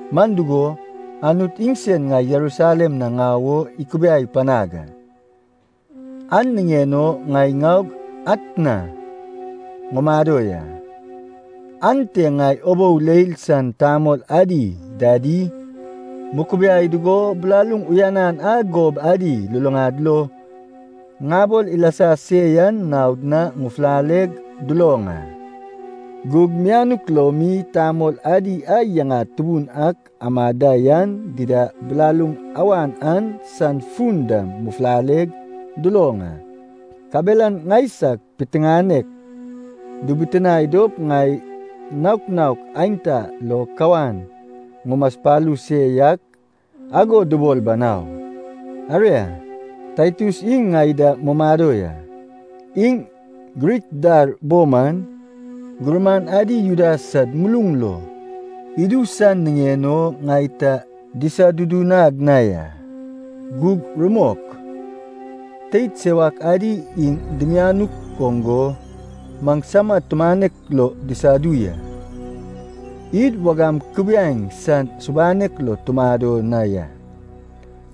Man dugo, Anut iŋsen ŋai Jerusalem na ŋau o ikubiai panag a, an niŋen o ŋai ŋaug atna ŋumado ya. Ante ŋai ubou leil san tamol adi dadi mukubiai dugo, bilaluŋ uyanan a gob adi luluŋad lo ŋabol ilasa se yan naod na ŋufulaleg duloŋ a. (Gug mianuk lo mi tamol adi a yaŋad tubun ak amad da yan dida bilaluŋ awan an san fun dam ŋufulaleg duloŋ a.) Kabelan ŋaisag piteŋanek dibitinae dop ŋai naok naok aenta lo kawan ŋumaspalu se yak ago dubol banau. Aria, Taitus iŋ ŋai da mumado ya, iŋ Grik dar bo man, gurman adi Juda sad muluŋ lo idu san niŋen o ŋai ta disadudunag na ya. Gug rumok, teid sewak adi iŋ dimianuk oŋ go, maŋsama tumanek lo disadu ya. Id wagam kubiaeŋ san subanek lo tumado na ya,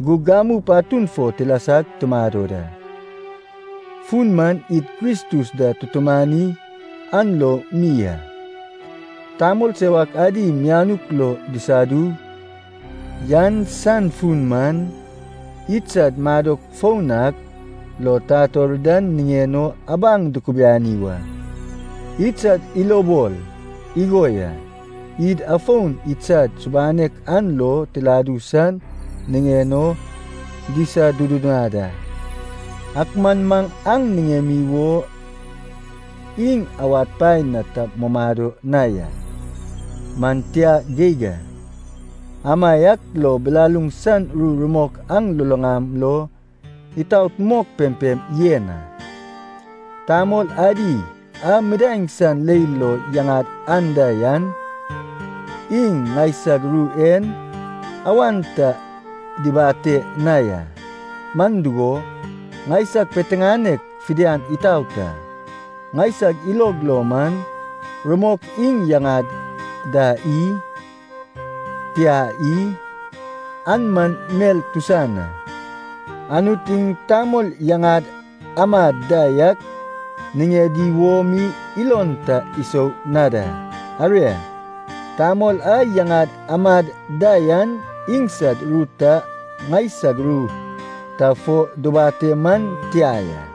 gug gamu patun fo tilasag tumado da. Fun man id Kristus da tutumani an lo mi a. Tamol sewak adi mianuk lo disadu yan san fun man, idsad madok foun ak lo tator dan niŋen o abaŋ dikibiani wa. Iŋsad ilobol igo ya, id afon iŋsad subanek an lo tiladu san niŋen o disadudunad a. Ak man maŋ aŋ niŋemi wo, iŋ awad paen na ta mumado na ya. Man tia geig a. Amaiak lo bilaluŋ san ru rumok aŋ luluŋam lo itaot mok pempem yen a. Tamol adi a midaeŋ san leil lo yaŋad anda yan, iŋ ŋaisag ru en awan ta dibate na ya, man dugo, ŋaisag piteŋanek fidian itaot a. (Ŋaisag ilog lo man, rumok iŋ yaŋad da i? Tia i? An man mel tusan a. Anut iŋ tamol yaŋad amad da yak niŋedi wo mi ilon ta isou na da.) Aria, tamol a yaŋad amad da yan iŋsad ru ta ŋaisag ru ta fo dubate man tia ya.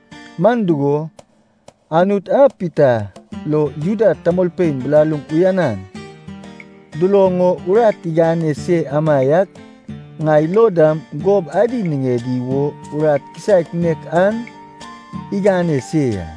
(Man dugo, Anut a Pita lo Juda tamolpein bilaluŋ uyanan duloŋ o urat igane se amaiak ŋai lo dam gob adi niŋedi wo urat kisaek nek an igane se ya.)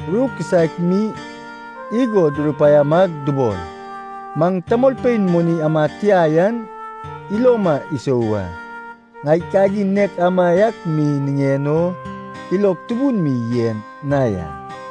Ru kisaek mi igo durupaiamag dubol, maŋ tamolpein moni amad tia yan iloma isou wa. Ŋai kagin nek amaiak mi niŋen o ilog tubun mi yen na ya.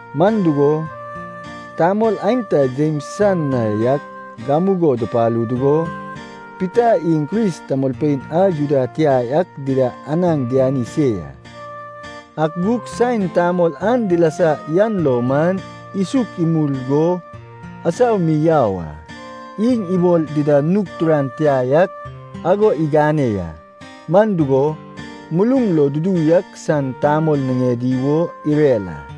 Man dugo, tamol aenta Jems san na yak gamugo dupalu dugo, Pita iŋ Kris tamolpein a Juda tia ak dida anaŋ diani se ya. Ak gug saen tamol an dilasa yan lo man, isuk imul go asau mi yau a, iŋ ibol dida nug turan tia yak ago igane ya. Man dugo, muluŋ lo dudu yak san tamol niŋedi wo irer a.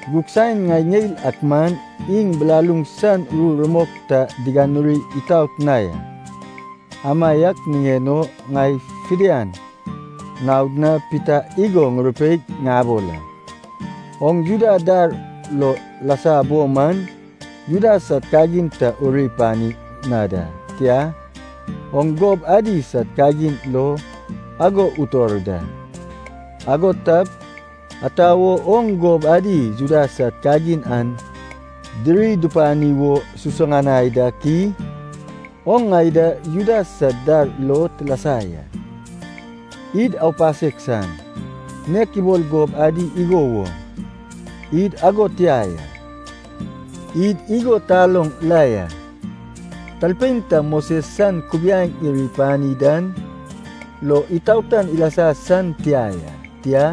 Gug saen ŋai ŋeil ak man iŋ bilaluŋ san ru rumok ta diganuri itaot na ya, amaiak niŋen o ŋai fidian naod na Pita igo ŋurupeig ŋabol a. “Oŋ Juda dar lo lasa bo man Juda sad kagin ta uri pani na da. Tia, oŋ gob adi sad kagin lo ago utor da. Ago tap, ata wo oŋ gob adi Juda sad kagin an diri dupani wo susuŋanai dak i? Oŋ ŋai da Juda sad dar lo tilasa ya, id ‘aupasek san’, nek ibol gob adi igo woŋ, id ago tia ya. Id igo taloŋ la ya. Talpein ta Moses san kubiaeŋ iri ipani dan lo itaotan ilasa san tia ya, tia,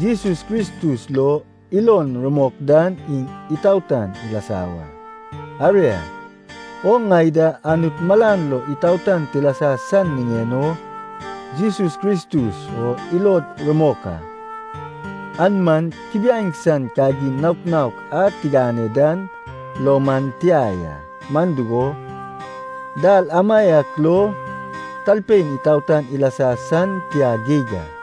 Jesus Kristus lo ilon rumok dan iŋ itaotan ilasa wa. Aria, oŋ ŋai da Anut malan lo itaotan tilasa san niŋen o Jesus Kristus o ilod rumok a. An man kubiaeŋ san kagin naok naok a tigane dan lo man tia ya, man dugo, dal amaiak lo talpein itaotan ilasa san tia geig a.”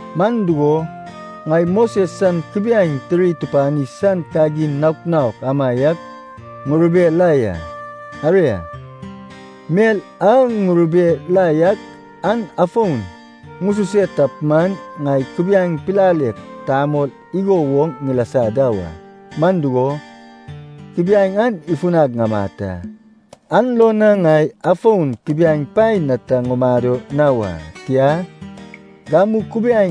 Man dugo, ŋai Moses san kubiaeŋ tiri tupani san kagin naok naok amaiak ŋurube la ya. Aria, mel a ŋurube la yak, an afon ŋususe tap man, ŋai kubiaeŋ pilalek tamol igo woŋ ŋilasa da wa. Man dugo, kubiaeŋ an ifunag ŋamat a, an lo na ŋai afon kubiaeŋ paen na ta ŋumado na wa. Tia, gamu kubiaeŋ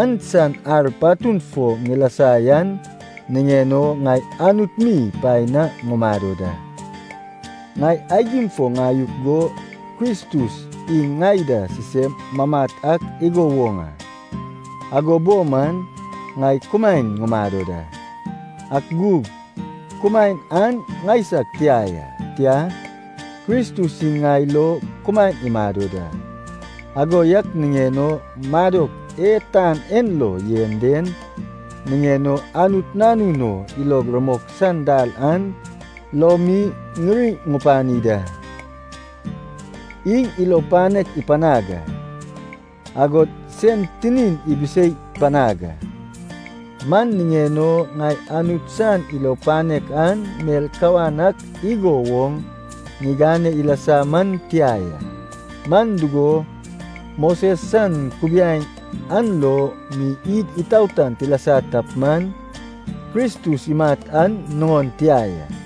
an san ar patun fo ŋilasa yan niŋen o, ŋai Anut mi paen na ŋumado da. Ŋai aigim fo ŋayuk go Kristus iŋ ŋai da sisem mamat ak igo woŋ a. Ago bo man, ŋai kumaen ŋumado da. Ak gug kumaen an ŋaisag tia ya. Tia, Kristus iŋ ŋai lo kumaen imado da. Ago yak niŋen o madok e tan en lo yen den niŋen o, Anut Nanun o ilog rumok san dal an lo mi ŋiri ŋupani da. Iŋ ilo panek ipanag a, agod sen tinin ibisei panag a. Man niŋen o, ŋai Anut san ilo panek an mel kawan ak igo woŋ ŋigane ilasa man tia ya. Man dugo, Moses san kubiaeŋ an lo mi id itaotan tilasa tap man, Kristus imat an nuŋon tia ya.”